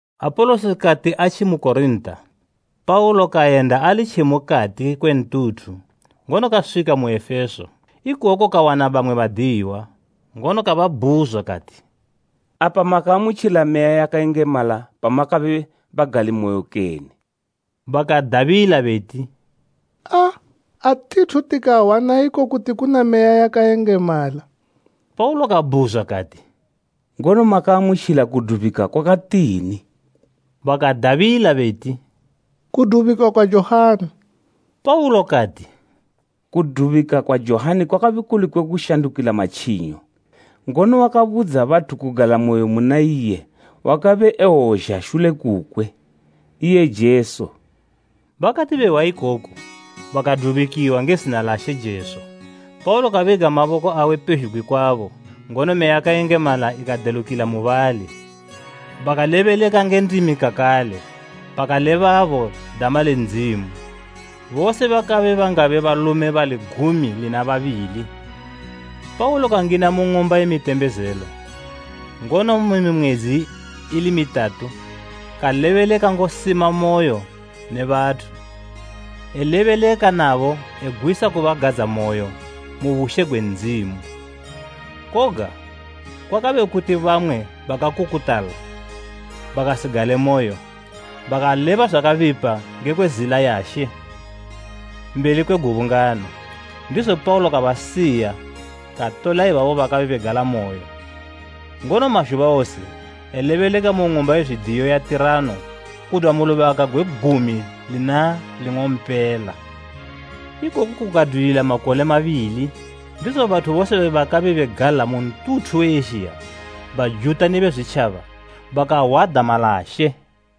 Apolosi kati atjimu Korinta, Paulo kayenda ali tje mukati kwe ntuthu, ngono kaswika mu Efeso. Ikoku kawana bamwe badiyiwa, ngono kababhuzwa kati, “Apa makaamutjila Meya yakayengemala pamakabe bagalimoyo kene?” Bakadabila beti, “Aa, atithu tikahwa na iko kuti kuna Meya yakayengemala.” Paulo kabhuzwa kati, “Ngono makaamutjila kudubikwa kwakatini?” Bakadabila beti, “Kudubikwa kwa Johani.” Paulo kati, “Kudubika kwa Johani kwakabe kuli kwe kushandukila matjinyo; ngono wakabudza bathu kugalamoyo muna iye wakabe ewozha shule kukwe, iye Jesu.” Bakati behwa ikoku, bakadubikwa nge zina la She Jesu. Paulo kabiga maboko awe pezhugwi kwabo, ngono Meya yakayengemala ikadelukila mubali; bakalebeleka nge ndimi kakale bakalebabo dama le Ndzimu. Bose bakabe bangabe balume bali gumi lina babili. Paulo kangina mu ng'umba ye mitembezelo, ngono mu mimwedzi ili mitatu kalebeleka ngosimamoyo ne bathu, elebeleka nabo egwisa kubagadzamoyo mu bushe gwe Ndzimu. Koga kwakabe kuti bamwe bakakukutala, bakasigalemoyo, bakaleba zwakabipa ngekwe Zila ya She mbeli kwe gubungano. Ndizo Paulo kabasiya, katola ibabo bakabe begalamoyo, ngono mazhuba wose elebeleka mu ng'umba ye zwidiyo ya Tirano kudwa mu lubaka gwe gumi lina ling'ompela. Ikoku kukadwilila makole mabili, ndizo bathu bose bakabe begala mu ntuthu we Ezhiya, Bajuta ne Bezwitjaba bakahwa dama la She.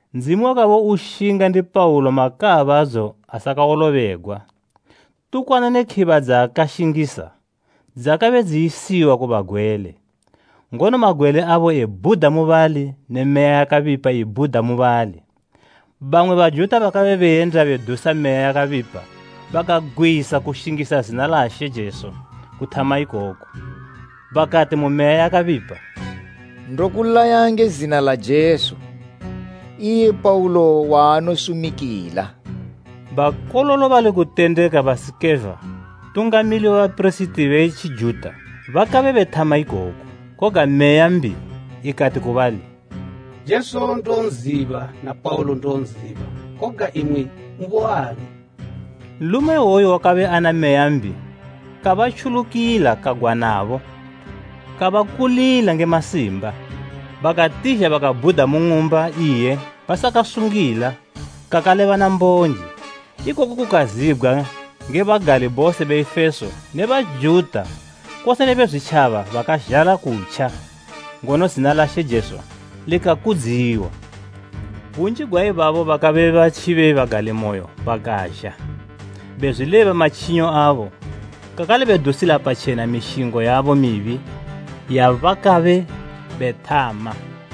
Ndzimu wakabe ushinga ndi Paulo makaabadzo asakawolobegwa. Tukwana ne khiba dzaakashingisa dzakabe dziyisiwa ku bagwele, ngono magwele abo ebhuda mubali ne meya yakabipa ibhuda mubali. Bamwe Bajuta bakabe beyenda bedusa meya yakabipa bakagwisa kushingisa zina la She Jesu kuthama ikoku. Bakati ku meya yakabipa, “Ndokulaya nge zina la Jesu, iye Paulo waanosumikila.” Bakololo bali kutendeka ba Sikeva Ntungamili we bapirisiti we Tjijuta bakabe bethama ikoku. Koga meya mbi ikati ku bali, “Jesu ndonziba, na Paulo ndonziba koga imwi, muboani?” Nlume iwoyo wakabe ana meya mbi kabatjulukila kagwanabo kabakulila nge masimba. Bakatizha bakabhuda mu ng'umba iye basakasungila kakale bana mbonje. Ikoku kukazibgwa nge bagali bose be Efeso ne Bajuta kose ne Bezwitjaba bakazhala kutja, ngono zina la She Jesu likakudziwa. Bunji gwa ibabo bakabe batjibe bagalimoyo bakazha, bezwileba matjinyo abo kakale bedusila patjena mishingo yabo mibi yabakabe bethama.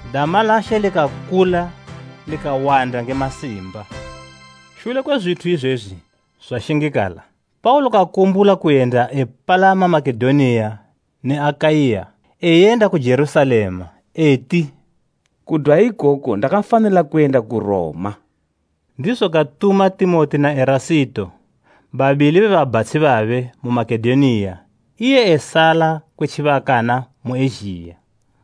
Dama la She likakula likawanda nge masimba. Shule kwe zwithu izwezwi zwashingikala, Paulo kakumbula kuyenda epalama Makedoniya ne Akaiya eyenda ku Jerusalema, eti, “Kudwa ikoko ndakafanila kuyenda ku Roma.” Ndizo katuma Timoti na Erasito, babili be babhatshi babe mu Makedoniya iye esala kwe tjibakana mu Ezhiya.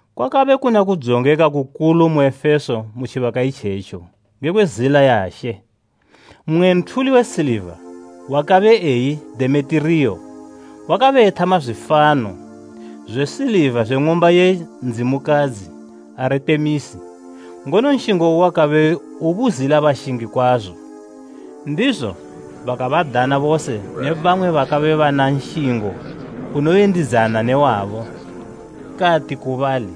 Kwakabe kuna kudzongeka kukulu mu Efeso mu tjibaka itjetjo ngekwe Zila ya She. Mmwe nthuli we siliva wakabe eyi Demetiriyo wakabe ethama zwifano zwe siliva zwe ng'umba ye ndzimukadzi Aritemisi, ngono nshingo uwe wakabe ubuzila bashingi kwazo. Ndizo kabadana bose ne bamwe bakabe bana nshingo unoyendidzana ne wabo, kati ku bali,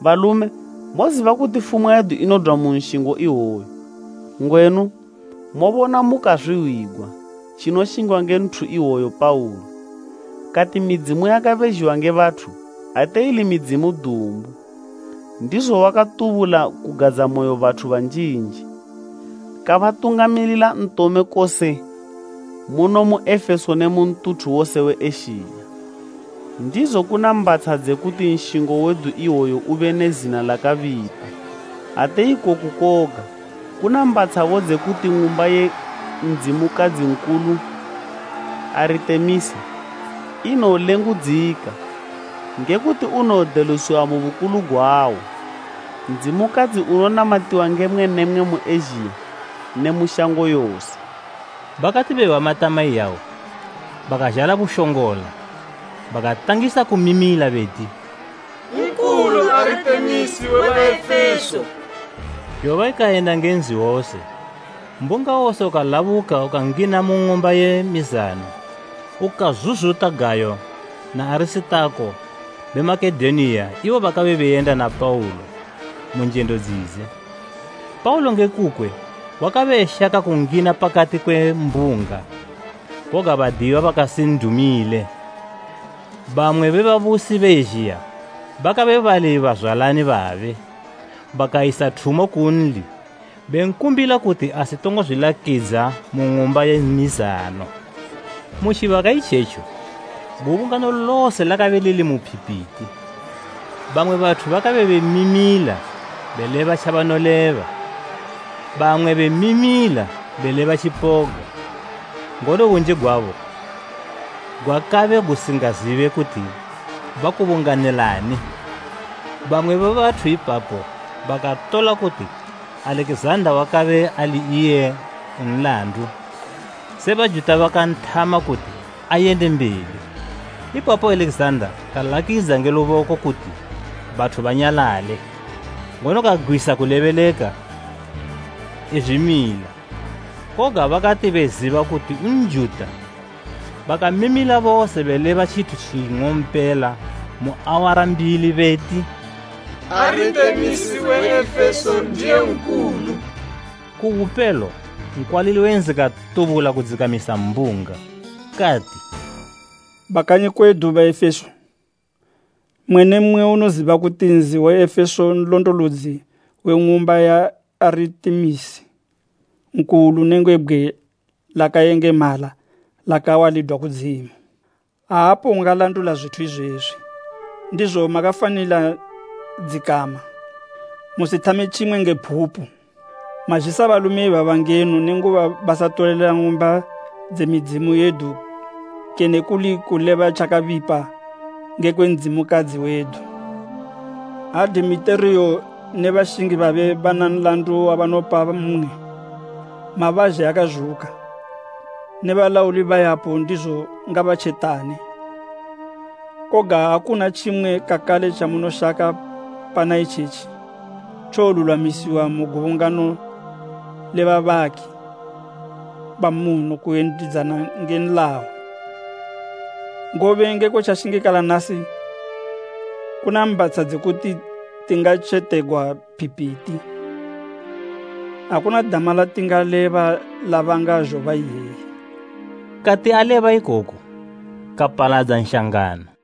“Balume, moziba kuti fumwa yedu inodwa mu nshingo iwoyu. Ngwenu, mobona mukazwihwigwa tjinoshingwa nge nthu iwoyu Paulo. Kati midzimu yakabezhiwa nge bathu ate ili midzimu dumbu, ndizo wakatubula kugadzamoyo bathu banjinji kabatungamilila ntome kose muno mu Efeso ne mu ntuthu wose we Ezhiya. Ndizo kuna mbhatsha dze kuti nshingo wedu iwoyu ube ne zina lakabipa. Ate ikoku koga, kuna mbatshabo dze kuti ng'umba ye ndzimukadzi nkulu Aritemisi inowolengudzika nge kuti unowodelusiwa mu bukulu gwawo, ndzimukadzi unonamatiwa nge mmwe ne mmwe mu Ezhiya ne mu shango yose!” Bakati behwa matama iyawa, bakazhala bushongola bakatangisa kumimila beti, “Nkulu Aritemisi we Baefeso!” Zhoba ikayenda nge nzi wose. Mbunga wose ukalabuka ukangina mu ng'umba ye mizano ukazuzuta Gayo na Arisitako be Makedoniya ibo bakabe beyenda na Paulo mu njendo dzidze. Paulo nge kukwe wakabe eshaka kungina pakati kwe mbunga, koga badiyiwa bakasin'dumile. Bamwe be babusi be Ezhiya, bakabe bali bazwalani babe, bakayisa thumo kunli benkumbila kuti asitongo zwilakidza mu ng'umba ye mizano. Mu tjibaka itjetjo gubungano lose lakabe lili mu phipiti, bamwe bathu bakabe bemimila beleba tjabanoleba, bamwe bemimila beleba tjipoga, ngono bunji gwabo gwakabe gusingazibe kuti bakubunganilani. Bamwe be bathu ipapo bakatola kuti Alekizanda wakabe ali iye u nlandu, se Bajuta bakanthama kuti ayende mbeli. Ipapo Alekizanda kalakidza nge luboko kuti bathu banyalale, ngono kagwisa kulebeleka ezwimila. Koga bakati beziba kuti Njuta, bakamimila bose beleba tjithu tjing'ompela mu awara mbili beti, “Aritemisi we Efeso ndiye nkulu!” Ku bupelo nkwalili we nzi katubula kudzikamisa mbunga. Kati, “Bakanyi kwedu Baefeso! Mmwe ne mmwe unoziba kuti nzi we Efeso nlondolodzi we ng'umba ya Aritemisi nkulu nenge bgwe lakayengemala lakawa lidwa kudzimu. Aapo ungalandula zwithu izwezwi. Ndizo makafanila dzikama, musithame tjimwe nge phupu. Mazhisa balume ibaba ngeno nenguba basatolela ng'umba dze midzimu yedu kene kuli kuleba tjakabipa ngekwe ndzimukadzi wedu. Ha Demetiriyo ne bashingi babe bana nlandu wabanopa mmwe, mabazhe akazhuka ne balauli bayapo ndizo ngabatjetane. Koga ha kuna tjimwe kakale tjamunoshaka, pana itjetji tjowolulwamisiwa mu gubungano le babaki bamuno kuyendidzana nge nlayo. Ngobe ngekwe tjashingikala nasi, kuna mbatsha dze kuti tingatjetegwa phipiti. Akuna dama latingaleba labanga zhoba iyeyi.” Kati aleba ikoku kapaladza nshangano.